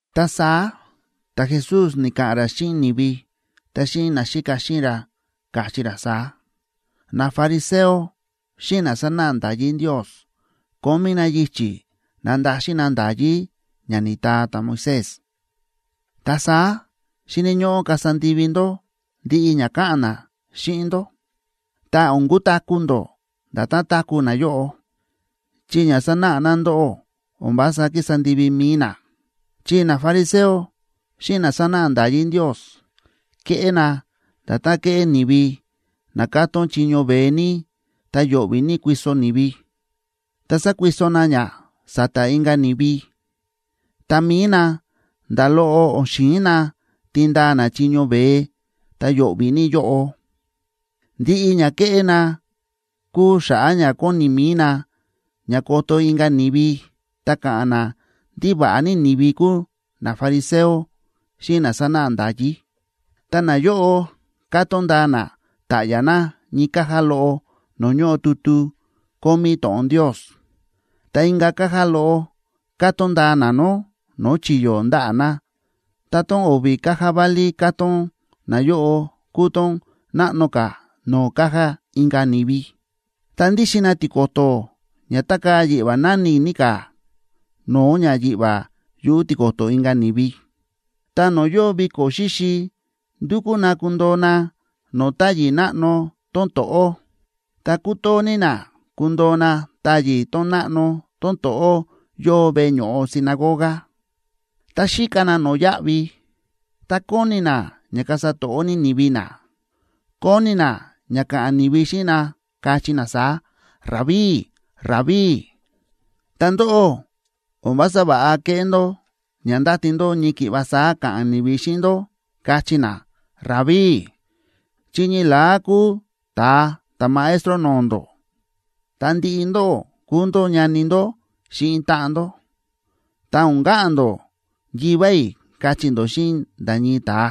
Ta saá ta̱Jesús ni̱ka̱ꞌa̱n ra xíꞌin ni̱vi, ta xíꞌin naxíka xíꞌin ra, káchí ra saá: ―Nafariseo xíꞌin na sánáꞌa nda̱yí Ndios kómí na yichi̱ nandaxin na nda̱yí ña ni̱taa ta̱Moisés. Ta saá xíni̱ ñóꞌó kasa ndivi ndó ndiꞌi ña káꞌa̱n na xíꞌin ndó. Ta o̱n kutaku̱ ndó nda̱tán táku̱ nayóꞌo, chi ña sánáꞌa na ndóꞌó o̱n vása kísa ndivi mi̱i na. Chi nafariseo xíꞌin na sánáꞌa nda̱yí Ndios kéꞌé na nda̱tán kéꞌé ni̱vi na kátón chiño veé ní ta yo̱ꞌvi̱ ní kuiso ni̱vi, ta sákuiso na ña sa̱ta̱ inka̱ ni̱vi, ta mi̱i na nda̱ loꞌo o̱n xi̱in na tindaa na chiño veé ta yo̱ꞌvi̱ ní yóꞌo. Ndiꞌi ña kéꞌé na kúu xa̱ꞌa̱ ña kóni mi̱i na ña koto inka̱ ni̱vi ta ka̱ꞌa̱n na ndí va̱ꞌa ní ni̱vi kúu nafariseo xíꞌin na sánáꞌa nda̱yí. Ta nayóꞌo kátón ndaa na ta̱ꞌya̱ na ñii caja loꞌo no̱o̱ ñóꞌo tutu kómí to̱ꞌon Ndios, ta inka̱ caja loꞌo kátón ndaa na nó no̱o̱ chi̱yo̱ ndaꞌa̱ na, ta tón o̱vi̱ caja válí kátón nayóꞌo kúu tón náꞌno ka̱ no̱o̱ caja inka̱ ni̱vi. Ta ndíxin na tiko̱to̱ ña tákaa̱ yiꞌva̱ náni̱ ní ka̱ no̱o̱ ña yiꞌva̱ yuꞌu̱ tiko̱to̱ inka̱ ni̱vi. Ta no̱o̱ yóo viko̱ xíxi, ndúkú na kundoo na no̱o̱ táyi̱ náꞌno tón to̱ꞌó. Ta kútoo ní na kundoo na táyi̱ tón náꞌno tón to̱ꞌó yóo veꞌe ño̱ꞌo sinagoga. Ta xíka na no̱yáꞌvi, ta kóni na ña kasa to̱ꞌó ní ni̱vi na, kóni na ña ka̱ꞌa̱n ni̱vi xíꞌin na, kachí na saá: “Rabí, ’Ta ndóꞌó, o̱n vása va̱ꞌa keꞌé ndó ña ndáti ndó ñii ki̱ꞌva saá ka̱ꞌa̱n ni̱vi xíꞌin ndó, kachí na: “Rabí”, chi ñii la̱á kúu ta̱a ta̱Maestro no̱o̱ ndó, ta ndiꞌi ndóꞌó kúu ndó ñani ndó xíꞌin táꞌan ndó. Ta o̱n ka̱ꞌa̱n ndó “Yivá i̱” kachí ndó xíꞌin nda̱ ñii ta̱a,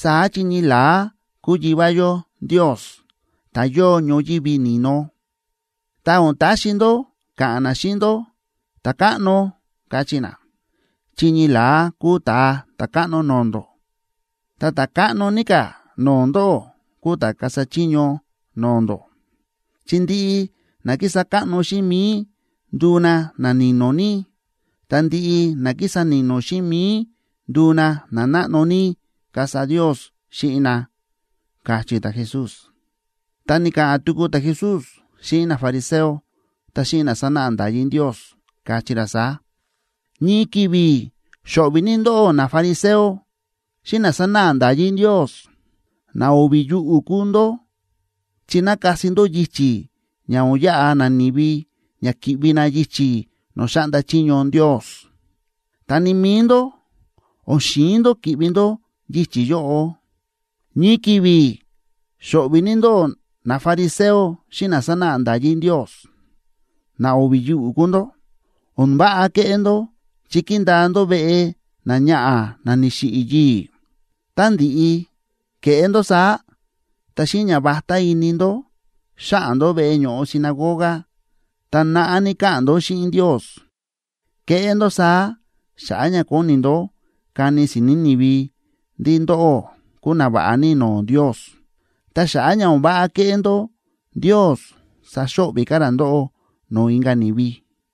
saá chi ñii la̱á kúu Yivá yó Ndios, ta̱ yóo ñoyívi ni̱no. Ta o̱n taxi ndó ka̱ꞌa̱n na xíꞌin ndó “Ta̱káꞌno” kachí na, chi ñii la̱á kúu Ta̱a Ta̱káꞌno no̱o̱ ndó. Ta ta̱ káꞌno ní ka̱ no̱o̱ ndóꞌó kuu ta̱ kasa chiño no̱o̱ ndó. Chi ndiꞌi na kísa káꞌno xíꞌin mi̱i nduu na nani̱no̱ ní, ta ndiꞌi na kísa ni̱no̱ xíꞌin mi̱i nduu na nanáꞌno ní, kasa Ndios xíꞌin na ―káchí ta̱Jesús. Ta ni̱ka̱ꞌa̱n tuku ta̱Jesús xíꞌin nafariseo ta xíꞌin na sánáꞌa nda̱yí Ndios, káchí ra saá: ―¡Ñii ki̱vi̱ xo̱ꞌvi̱ ní ndóꞌó, nafariseo xíꞌin na sánáꞌa nda̱yí Ndios! ¡Na o̱vi̱ yuꞌu̱ kúu ndó! Chi nákasi ndó yichi̱ ña o̱n yaꞌa nani̱vi ña ki̱ꞌvi na yichi̱ no̱o̱ xáꞌnda chiño Ndios. Ta ni mi̱i ndó, o̱n xi̱in ndó ki̱ꞌvi ndó yichi̱ yóꞌo. ’¡Ñii ki̱vi̱ xo̱ꞌvi̱ ní ndóꞌó, nafariseo xíꞌin na sánáꞌa nda̱yí Ndios! ¡Na o̱vi̱ yuꞌu̱ kúu ndó! O̱n váꞌa kéꞌé ndó chi kíndaa ndó veꞌe náñaꞌa̱ ná ni̱xiꞌi̱ yii̱. Tá ndi̱ꞌi ke̱ꞌé ndó saá, ta xíꞌin ñavatá ini ndó, xáꞌa̱n ndó veꞌe ño̱ꞌo sinagoga, ta naꞌá ní káꞌa̱n ndó xíꞌin Ndios. Kéꞌé ndó saá xa̱ꞌa̱ ña kóni ndó kani si̱ni̱ ni̱vi ndí ndóꞌó kúu nava̱ꞌa ní no̱o̱ Ndios. Ta xa̱ꞌa̱ ña o̱n váꞌa kéꞌé ndó, Ndios saxo̱ꞌvi̱ ka̱ ra ndóꞌó no̱o̱ inka̱ ni̱vi.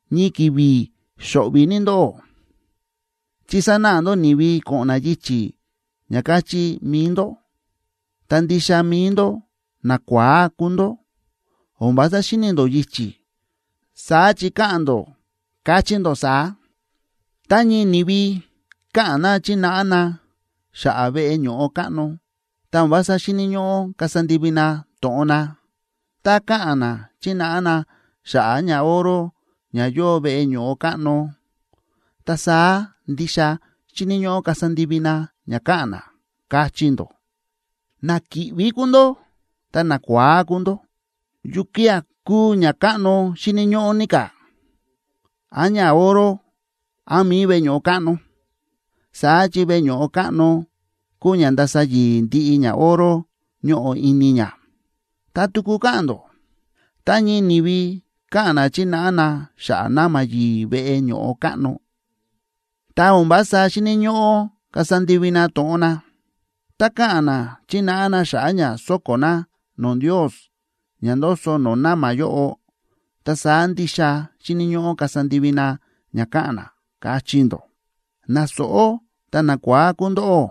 ’¡Ñii ki̱vi̱ xo̱ꞌvi̱ ní ndóꞌó, chi sánáꞌa ndó ni̱vi ko̱ꞌo̱n na yichi̱ ña káchí mi̱i ndó, ta ndixa mi̱i ndó nakua̱á kúu ndó, o̱n vása xíni ndó yichi̱! Saá chi káꞌa̱n ndó, káchí ndó saá: “Tá ñii ni̱vi káꞌa̱n na chínáꞌa na xa̱ꞌa̱ veꞌe ño̱ꞌo káꞌno, ta o̱n vása xíni̱ ñóꞌó kasa ndivi na to̱ꞌon na. Tá káꞌa̱n na chínáꞌa na xa̱ꞌa̱ ñaoro ña yóo veꞌe ño̱ꞌo káꞌno, ta saá ndixa xíni̱ ñóꞌó kasa ndivi na ña káꞌa̱n na”, káchí ndó. ¡Na kíꞌví kúu ndó ta nakua̱á kúu ndó! ¿Yukía̱ kúu ñakáꞌno xíni̱ ñóꞌó ní ka̱? ¿Án ñaoro, án mi̱i veꞌe ño̱ꞌo káꞌno?, saá chi veꞌe ño̱ꞌo káꞌno kúu ña ndása yi̱i̱ ndiꞌi ñaoro ñóꞌo ini ña. Ta tuku káꞌa̱n ndó: “Tá ñii ni̱vi káꞌa̱n na chínáꞌa na xa̱ꞌa̱ na̱ma̱ yi̱i̱ veꞌe ño̱ꞌo káꞌno, ta o̱n vása xíni̱ ñóꞌó kasa ndivi na to̱ꞌon na. Tá káꞌa̱n na chínáꞌa na xa̱ꞌa̱ ña so̱ko̱ na no̱o̱ Ndios ña ndoso no̱o̱ na̱ma̱ yóꞌo, ta saá ndixa xíni̱ ñóꞌó kasa ndivi na ña káꞌa̱n na”, káchí ndó. ¡Na sóꞌó ta nakua̱á kúu ndóꞌó!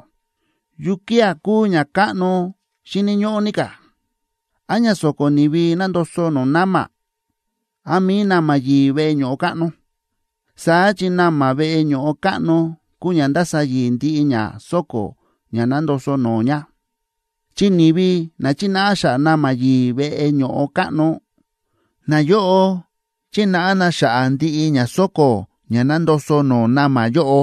¿Yukía̱ kúu ñakáꞌno xíni̱ ñóꞌó ní ka̱? ¿Án ña sóko̱ ni̱vi nándoso no̱o̱ na̱ma̱, án mi̱i na̱ma̱ yi̱i̱ veꞌe ño̱ꞌo káꞌno?, saá chi na̱ma̱ veꞌe ño̱ꞌo káꞌno kúu ña ndása yi̱i̱ ndiꞌi ña sóko̱ ña nándoso no̱o̱ ña. Chi ni̱vi na chínáꞌa xa̱ꞌa̱ na̱ma̱ yi̱i̱ veꞌe ño̱ꞌo káꞌno, nayóꞌo chínáꞌa na xa̱ꞌa̱ ndiꞌi ña sóko̱ ña nándoso no̱o̱ na̱ma̱ yóꞌo,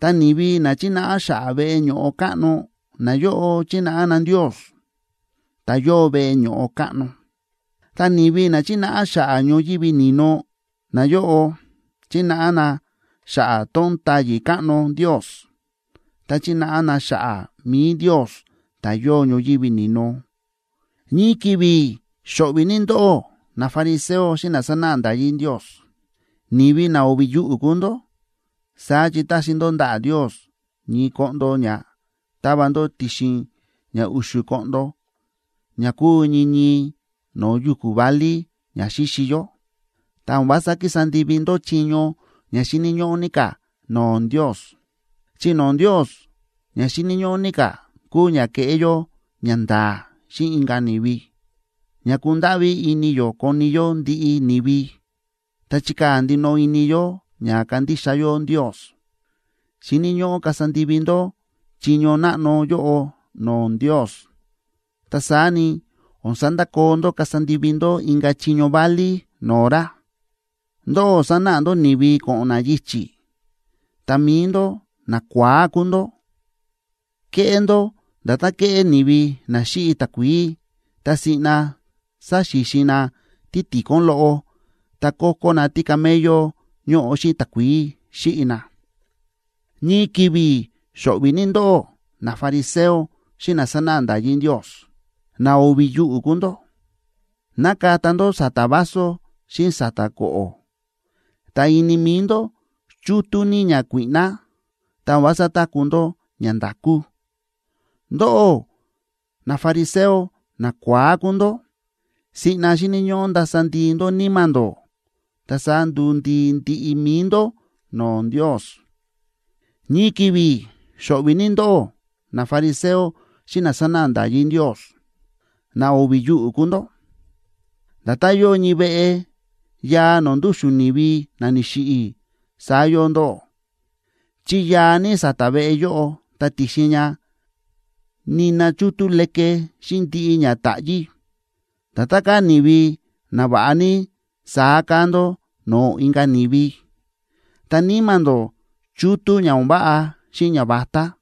ta ni̱vi na chínáꞌa xa̱ꞌa̱ veꞌe ño̱ꞌo káꞌno, nayóꞌo chínáꞌa na Ndios, ta̱ yóo veꞌe ño̱ꞌo káꞌno. Ta ni̱vi na chínáꞌa xa̱ꞌa̱ ñoyívi ni̱no, nayóꞌo chínáꞌa na xa̱ꞌa̱ tón táyi̱ káꞌno Ndios, ta chínáꞌa na xa̱ꞌa̱ mi̱i Ndios, ta̱ yóo ñoyívi ni̱no. ’¡Ñii ki̱vi̱ xo̱ꞌvi̱ ní ndóꞌó, nafariseo xíꞌin na sánáꞌa nda̱yí Ndios! ¡Ni̱vi na o̱vi̱ yuꞌu̱ kúu ndó! Saá chi táxi ndó ndaꞌa̱ Ndios ñii koꞌndo ña ta̱va ndó ti̱xin ña u̱xu̱ koꞌndo ña kúu ñii ñii no̱o̱ yu̱ku̱ válí ña xíxi yó,b ta o̱n vása kísa ndivi ndó chiño ña xíni̱ ñóꞌó ní ka̱ no̱o̱ Ndios. Chi no̱o̱ Ndios ña xíni̱ ñóꞌó ní ka̱ kúu ña keꞌé yó ñanda̱a̱ xíꞌin inka̱ ni̱vi, ña kundáꞌví ini yó koni yó ndiꞌi ni̱vi, ta chikaa̱ ndinoꞌo ini yó ña kandixa yó Ndios. Xíni̱ ñóꞌó kasa ndivi ndó chiño náꞌno yóꞌo no̱o̱ Ndios. Ta saá ni, o̱n sandakoo ndó kasa ndivi ndó inka̱ chiño válí no̱o̱ ra. ¡Ndóꞌó sánáꞌa ndó ni̱vi ko̱ꞌo̱n na yichi̱, ta mi̱i ndó nakua̱á kúu ndó! Kéꞌé ndó nda̱tán kéꞌé ni̱vi na xíꞌi takuií ta siꞌna sáxixin na títikon loꞌo ta ko̱ko̱ na tícamello ñóꞌo xíꞌin takuií xíꞌi na. ’¡Ñii ki̱vi̱ xo̱ꞌvi̱ ní ndóꞌó, nafariseo xíꞌin na sánáꞌa nda̱yí Ndios! ¡Na o̱vi̱ yuꞌu̱ kúu ndó! Nákata ndó sa̱ta̱ vaso xíꞌin sa̱ta̱ ko̱ꞌo̱, ta ini mi̱i ndó chútú ní ñakuíꞌná, ta o̱n vása táku̱ ndó ñanda̱kú. ¡Ndóꞌó nafariseo nakua̱á kúu ndó! Siꞌna xíni̱ ñóꞌó ndasa ndii ndó níma̱ ndó, ta saá nduu ndii ndiꞌi mi̱i ndó no̱o̱ Ndios. ’¡Ñii ki̱vi̱ xo̱ꞌvi̱ ní ndóꞌó, nafariseo xíꞌin na sánáꞌa nda̱yí Ndios! ¡Na o̱vi̱ yuꞌu̱ kúu ndó! Nda̱tán yóo ñii veꞌe yaa no̱o̱ ndúxu̱n ni̱vi na ni̱xiꞌi̱, saá yóo ndóꞌó, chi yaa ní sa̱ta̱ veꞌe yóꞌo ta ti̱xin ña nina chútú leke xíꞌin ndiꞌi ña táꞌyí. Nda̱tán káa ni̱vi nava̱ꞌa ní, saá káa ndó no̱o̱ inka̱ ni̱vi, ta níma̱ ndó chútú ña o̱n váꞌa xíꞌin ñavatá.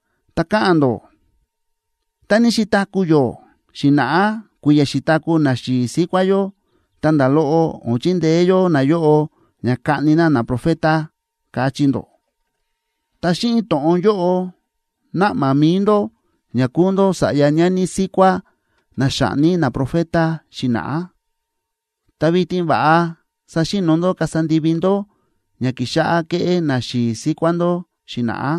Ta káꞌa̱n ndó: “Tá ní xi̱taku̱ yó xi̱na̱ꞌá kui̱ya̱ xi̱taku̱ naxi̱i̱ síkuá yó, ta nda̱ loꞌo o̱n chindeé yó nayóꞌo ña kaꞌni na naprofeta”, káchí ndó. Ta xíꞌin to̱ꞌon yóꞌo náꞌma mi̱i ndó ña kúu ndó sa̱ꞌya ñani síkuá na xa̱ꞌni naprofeta xi̱na̱ꞌá. ¡Ta vitin va̱ꞌa saxi̱no̱ ndó kasa ndivi ndó ña ki̱xáꞌá kéꞌé naxi̱i̱ síkuá ndó xi̱na̱ꞌá!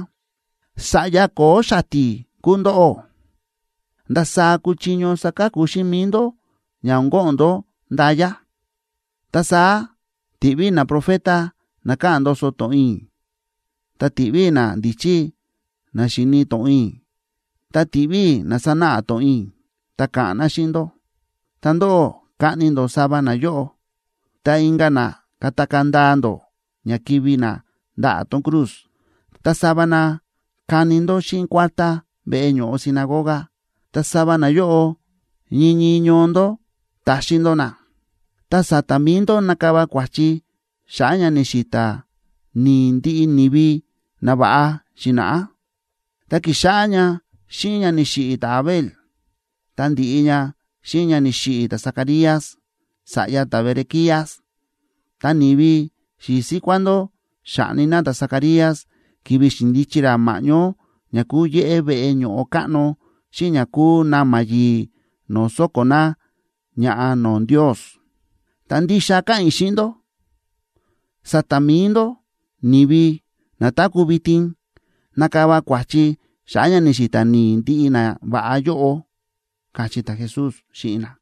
’¡Sa̱ꞌya ko̱o̱ xati̱ kúu ndóꞌó! ¿Ndasaá kuchiño saka̱ku xíꞌin mi̱i ndó ña o̱n ko̱ꞌo̱n ndó nda̱ya? Ta saá tiꞌví i̱ naprofeta na káꞌa̱n ndoso to̱ꞌon i̱, ta tiꞌví i̱ nandíchí na xíni̱ to̱ꞌon i̱, ta tiꞌví i̱ na sánáꞌa to̱ꞌon i̱ ta ka̱ꞌa̱n na xíꞌin ndó. Ta ndóꞌó kaꞌni ndó sava nayóꞌo, ta inka̱ na katakaa̱ ndaa ndó ña kivi̱ na ndaꞌa̱ tón cruz, ta sava na kani ndó xíꞌin kuártá veꞌe ño̱ꞌo sinagoga, ta sava nayóꞌo ñii ñii ñoo ndó taxin ndó na. Ta sa̱ta̱ mi̱i ndó nakava kua̱chi xa̱ꞌa̱ ña ni̱xi̱ta̱ ni̱i̱ ndiꞌi ni̱vi nava̱ꞌa xi̱na̱ꞌá, ta ki̱xáꞌá ña xíꞌin ña ni̱xiꞌi̱ ta̱Abel,c ta ndi̱ꞌi ña xíꞌin ña ni̱xiꞌi̱ ta̱Zacarías, sa̱ꞌya ta̱Berequías. Ta ni̱vi xi̱i̱ síkuá ndó xa̱ꞌni na ta̱Zacarías ki̱vi̱ xi̱ndichi ra ma̱ꞌñó ña kúu yéꞌé veꞌe ño̱ꞌo káꞌno xíꞌin ña kúu na̱ma̱ yi̱i̱ no̱o̱ sóko̱ na ña̱ꞌa no̱o̱ Ndios. Ta ndixa káꞌa̱n i̱ xíꞌin ndó, sa̱ta̱ mi̱i ndó ni̱vi na táku̱ vitin, nakava kua̱chi xa̱ꞌa̱ ña ni̱xi̱ta̱ ni̱i̱ ndiꞌi nava̱ꞌa yóꞌo ―káchí ta̱Jesús xíꞌin na.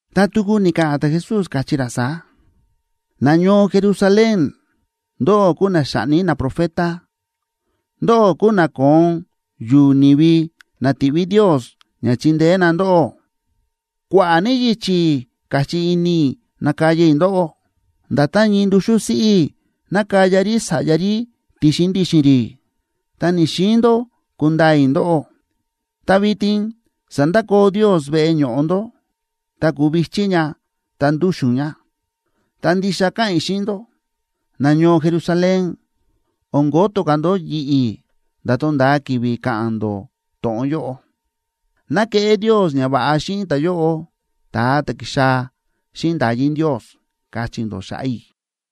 Ta tuku ni̱ka̱ꞌa̱n ta̱Jesús, káchí ra saá: ―¡Nañoo Jerusalén, ndóꞌó kúu na xáꞌni naprofeta, ndóꞌó kúu na kóon yu̱u̱ ni̱vi na ti̱ꞌví Ndios ña chindeé na ndóꞌó! ¡Kua̱ꞌa̱ ní yichi̱ káchí ini i̱ nakaya i̱ ndóꞌó, nda̱tán ñii nduxú siꞌí nákaya rí sa̱ꞌya rí ti̱xin ndi̱xi̱n rí, ta ni̱‑xiin ndó kundaa i̱ ndóꞌó! Ta vitin sandakoo Ndios veꞌe ño̱ꞌo ndó, ta kuu vi̱chí ña ta ndu̱xu̱n ña. Ta ndixa káꞌa̱n i̱ xíꞌin ndó, nañoo Jerusalén, o̱n koto ka̱ ndó yi̱ꞌi̱ nda̱ tonda̱a ki̱vi̱ ka̱ꞌa̱n ndó to̱ꞌon yóꞌo: “Ná keꞌé Ndios ñava̱ꞌa xíꞌin ta̱yóꞌo, ta̱a ta̱ ki̱xaa̱ xíꞌin nda̱yí Ndios”, kachí ndó xa̱ꞌa̱ i̱.